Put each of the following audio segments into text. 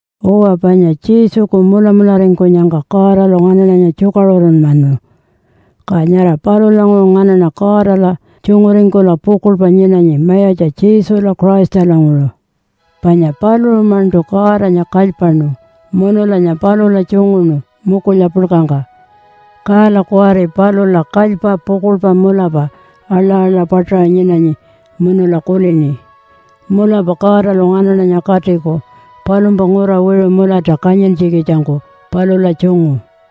Uwa, panya Jesuku mulamularingkunyangka Godalu nganaṉanya tjukaṟurunmanu. Ka nyara palulanguṟu nganaṉa Godala tjunguringkula pukuḻpa nyinanyi Mayatja Jesula Christalanguṟu. Panya paluṟu-maṉṯu Godanya kalypaṉu munulanya palula tjunguṉu mukulya puḻkangka. Kala kuwari palula kalypa pukuḻpa mulapa aḻa-aḻa paṯaṟa nyinanyi munula kulini, “Mulapa Godalu nganaṉanya katiku palumpa ngura wiṟu mulata kanyintjikitjangku palula tjungu.”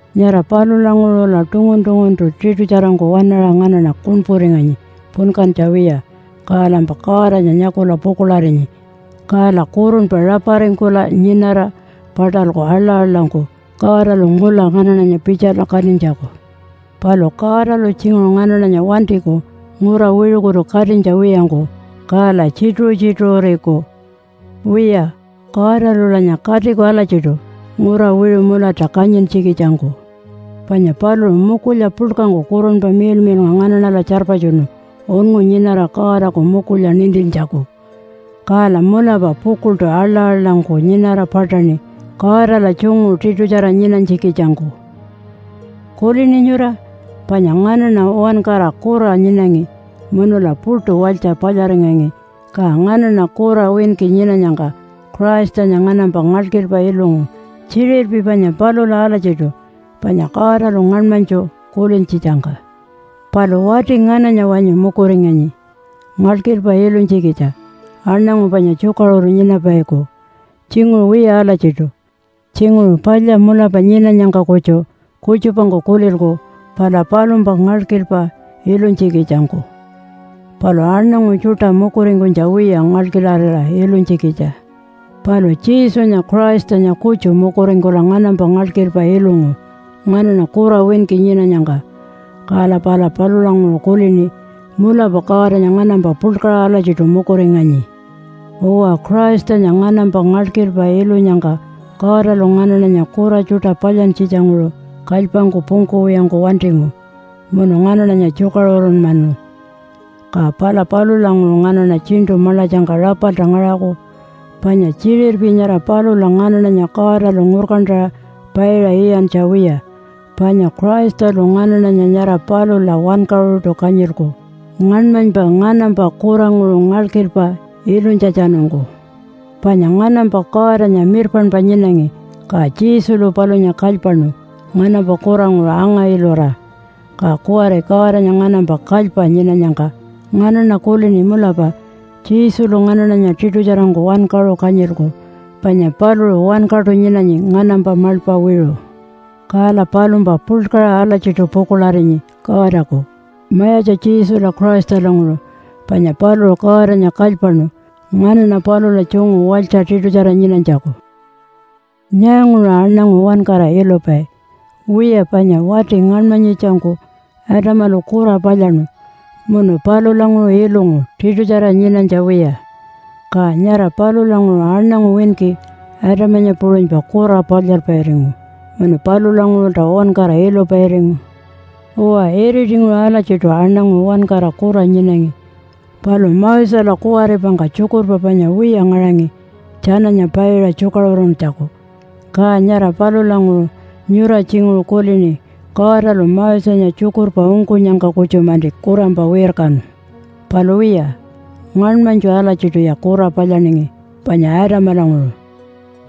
Nyara palulanguṟula tungun-tunguntu tiṯutjarangku waṉaṟa nganaṉa kuṉpuringanyi punkantja wiya, kalampa Godanya nyakula pukuḻarinyi. Kala kurunpa raparingkula nyinara paṯalku aḻa-aḻangku Godalu ngula nganaṉanya pitjala katinytjaku. Palu Godalu tjinguṟu nganaṉanya wantiku ngura wiṟukutu katinytja wiyangku, kala tjituṟu-tjituṟuriku. Wiya, Godalulanya katiku alatjiṯu ngura wiṟu mulata kanyintjikitjangku. Panya paluṟu mukulya puḻkangku Kurunpa Miḻmiḻnga nganaṉala tjarpatjunu unngu nyinara Godaku mukulya nintintjaku. Kala mulapa pukuḻṯu aḻa-aḻangku nyinara paṯaṉi Godala tjungu tiṯutjara nyinanytjikitjangku. Kulini nyura? Panya nganaṉa uwankara kura nyinangi munula puṯu walytja palyaringangi, ka nganaṉa kura winki nyinanyangka Christanya nganampa ngalkilpa ilungu tjiṟirpi panya palula alatjiṯu, panya Godalu ngaṉmanytju kulintjitjangka. Palu wati ngananya wanyu mukuringanyi ngalkilpa ilunytjikitja aṉangu panya tjukaṟuru nyinapaiku? Tjinguṟu wiya alatjiṯu. Tjinguṟu palya mulapa nyinanyangka kutju kutjupangku kulilku pala palumpa ngalkilpa ilunytjikitjangku. Palu aṉangu tjuṯa mukuringkunytja wiya ngalkilarira ilunytjikitja. Palu Jesunya Christanya kutju mukuringkula nganampa ngalkilpa ilungu nganaṉa kura winki nyinanyangka. Kala pala palulanguṟu kulini, “Mulapa Godanya nganampa puḻkaṟa alatjiṯu mukuringanyi.” Uwa, Christanya nganampa ngalkilpa ilunyangka Godalu nganaṉanya kura tjuṯa palyantjitjanguṟu kalypangku pungkuwiyangku wantingu munu nganaṉanya tjukaṟurunmanu. Ka pala palulanguṟu nganaṉa tjiṉṯu maḻatjangka rapalta ngaṟaku. Panya tjiṟirpi nyara palula nganaṉanya Godalu ngurkantaṟa paiṟa iyantja wiya, panya Christalu nganaṉanya nyara palula wankaṟuṯu kanyilku ngaṉmanypa nganampa kuranguṟu ngalkilpa ilunytjatjanungku. Panya nganampa Godanya mirpaṉpa nyinangi, ka Jesulu palunya kalypaṉu nganampa kuranguṟu anga-ilura. Ka kuwari Godanya nganampa kalypa nyinanyangka nganaṉa kulini mulapa Jesulu nganaṉanya tiṯutjarangku wankaṟu kanyilku panya paluṟu wankaṯu nyinanyi nganampa maḻpa wiṟu. Kala palumpa puḻkaṟa alatjiṯu pukuḻarinyi Godaku Mayatja Jesula Christalanguṟu, panya paluṟu Godanya kalypaṉu nganaṉa palula tjungu walytja tiṯutjara nyinanytjaku. Nyaanguṟu aṉangu uwankara ilupai? Wiya panya wati ngaṉmanyitjangku Adamalu kura palyaṉu munu palulanguṟu ilungu tiṯutjara nyinanytja wiya. Ka nyara palulanguṟu aṉangu winki Adamanya puṟunypa kura palyalpairingu, munu palulanguṟulta uwankara ilupairingu. Uwa, iritinguṟu alatjiṯu aṉangu uwankara kura nyinangi. Palu Mosela kuwaripangka tjukurpa panya wiya ngaṟangi tjananya paiṟa tjukaṟuruntjaku, ka nyara palulanguṟu nyura tjinguṟu kulini Godalu Mosenya tjukurpa ungkunyangka kutju-manti kurampa wirkanu. Palu wiya, ngaṉmanytju alatjiṯuya kura palyaningi, panya Adamalanguṟu.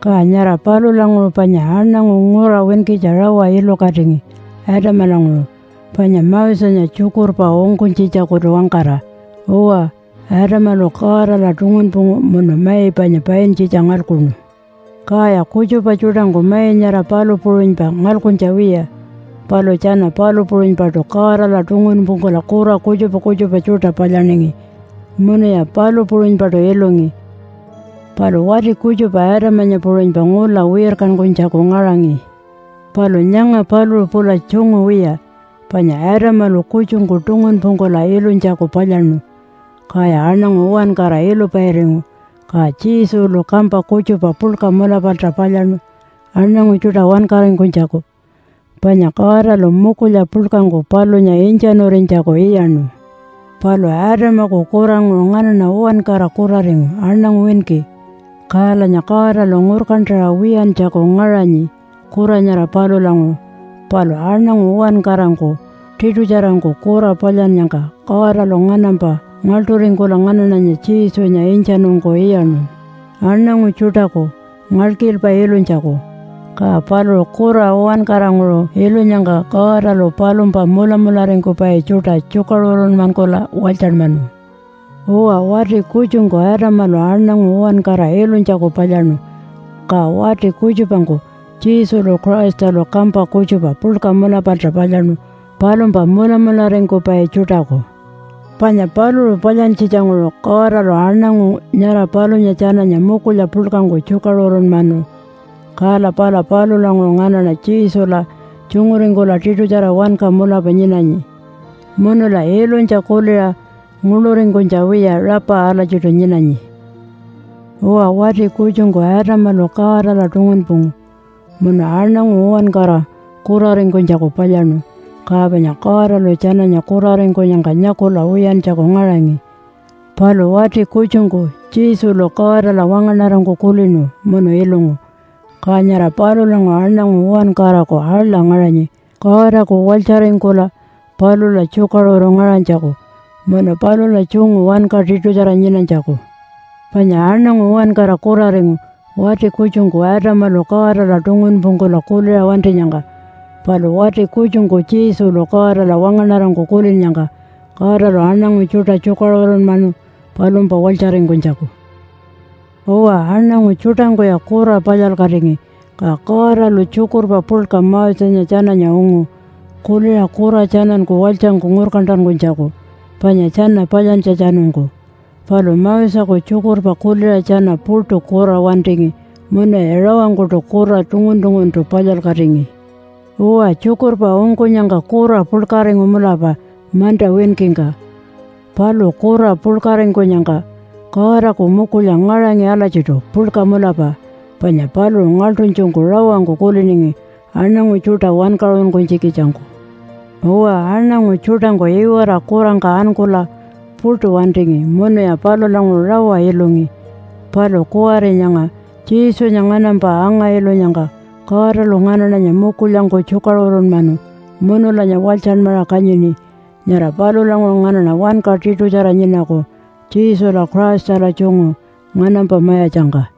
Ka nyara palulanguṟu panya aṉangu ngura winkitja rawa ilukatingi Adamalanguṟu panya Mosenya tjukurpa ungkunytjitjakutu-wangkara. Uwa, Adamalu Godala tungunpungu munu mai panya paintjitja ngalkuṉu. Kaya kutjupa tjuṯangku mai nyara palu puṟunypa ngalkuntja wiya, palu tjana palu puṟunypaṯu Godala tungunpungkula kura kutjupa kutjupa tjuṯa palyaningi munuya palu puṟunypaṯu ilungi. Palu wati kutjupa Adamanya puṟunypa ngula wirkankunytjaku ngaṟangi. Palu nyanga paluṟu pula tjungu wiya. Panya Adamalu kutjungku tungunpungkula ilunytjaku palyaṉu, kaya aṉangu uwankara ilupairingu. Ka Jesulu kampa kutjupa puḻka mulapalta palyaṉu aṉangu tjuṯa wankaringkunytjaku, panya Godalu mukulya puḻkangku palunya intjanurinytjaku iyaṉu. Palu Adamaku kuranguṟu nganaṉa uwankara kuraringu aṉangu winki, kalanya Godalu ngurkantaṟa wiyantjaku ngaṟanyi kura nyara palulanguṟu. Palu aṉangu uwankarangku tiṯutjarangku kura palyannyangka Godalu nganampa ngaḻṯuringkula nganaṉanya Jesunya intjanungku iyaṉu aṉangu tjuṯaku ngalkilpa ilunytjaku, ka paluṟu kura uwankaranguṟu ilunyangka Godalu palumpa mulamularingkupai tjuṯa tjukaṟurunmankula walytjanmanu. Uwa, wati kutjungku Adamalu aṉangu uwankara ilunytjaku palyaṉu. Ka wati kutjupangku Jesulu Christalu kampa kutjupa puḻka mulapalta palyaṉu palumpa mulamularingkupai tjuṯaku. Panya paluṟu palyantjitjanguṟu Godalu aṉangu nyara palunya tjananya mukulya puḻkangku tjukaṟurunmanu. Kala pala palulanguṟu nganaṉa Jesula tjunguringkula tiṯutjara wanka mulapa nyinanyi munula ilunytja kuliṟa nguḻuringkunytja wiya, rapa alatjiṯu nyinanyi. Uwa, wati kutjungku Adamalu Godala tungunpungu munu aṉangu uwankara kuraringkunytjaku palyaṉu, ka panya Godalu tjananya kuraringkunyangka nyakula wiyantjaku ngaṟangi. Palu wati kutjungku Jesulu Godala wangaṉarangku kulinu munu ilungu, ka nyara palulanguṟu aṉangu uwankaraku aḻa ngaṟanyi Godaku walytjaringkula palula tjukaṟuru ngaṟanytjaku munu palula tjungu wanka tiṯutjara nyinanytjaku. Panya aṉangu uwankara kuraringu wati kutjungku Adamalu Godala tungunpungkula kuliṟa wantinyangka. Palu wati kutjungku Jesulu Godala wangaṉarangku kulinnyangka Godalu aṉangu tjuṯa tjukaṟurunmanu palumpa walytjaringkunytjaku. Uwa, aṉangu tjuṯangkuya kura palyalkatingi, ka Godalu tjukurpa puḻka Mosenya tjananya ungu kuliṟa kura tjananku walytjangku ngurkantankunytjaku panya tjana palyantjatjanungku. Palu Moseku tjukurpa kuliṟa tjana puṯu kura wantingi munuya rawangkuṯu kura tungun-tunguntu palyalkatingi. Uwa, tjukurpa ungkunyangka kura puḻkaringu mulapa manta winkingka. Palu kura puḻkaringkunyangka Godaku mukulya ngaṟangi alatjiṯu puḻka mulapa, panya paluṟu ngaḻṯunytjungku rawangku kuliningi aṉangu tjuṯa wankaṟunkunytjikitjangku. Uwa, aṉangu tjuṯangku iwara kurangka ankula puṯu wantingi munuya palulanguṟu rawa ilungi. Palu kuwari nyanga Jesunya nganampa anga-ilunyangka Godalu nganaṉanya mukulyangku tjukaṟurunmanu munulanya walytjanmaṟa kanyini. Nyara palulanguṟu nganaṉa wanka tiṯutjara nyinaku Jesula Christala tjungu nganampa mayatjangka.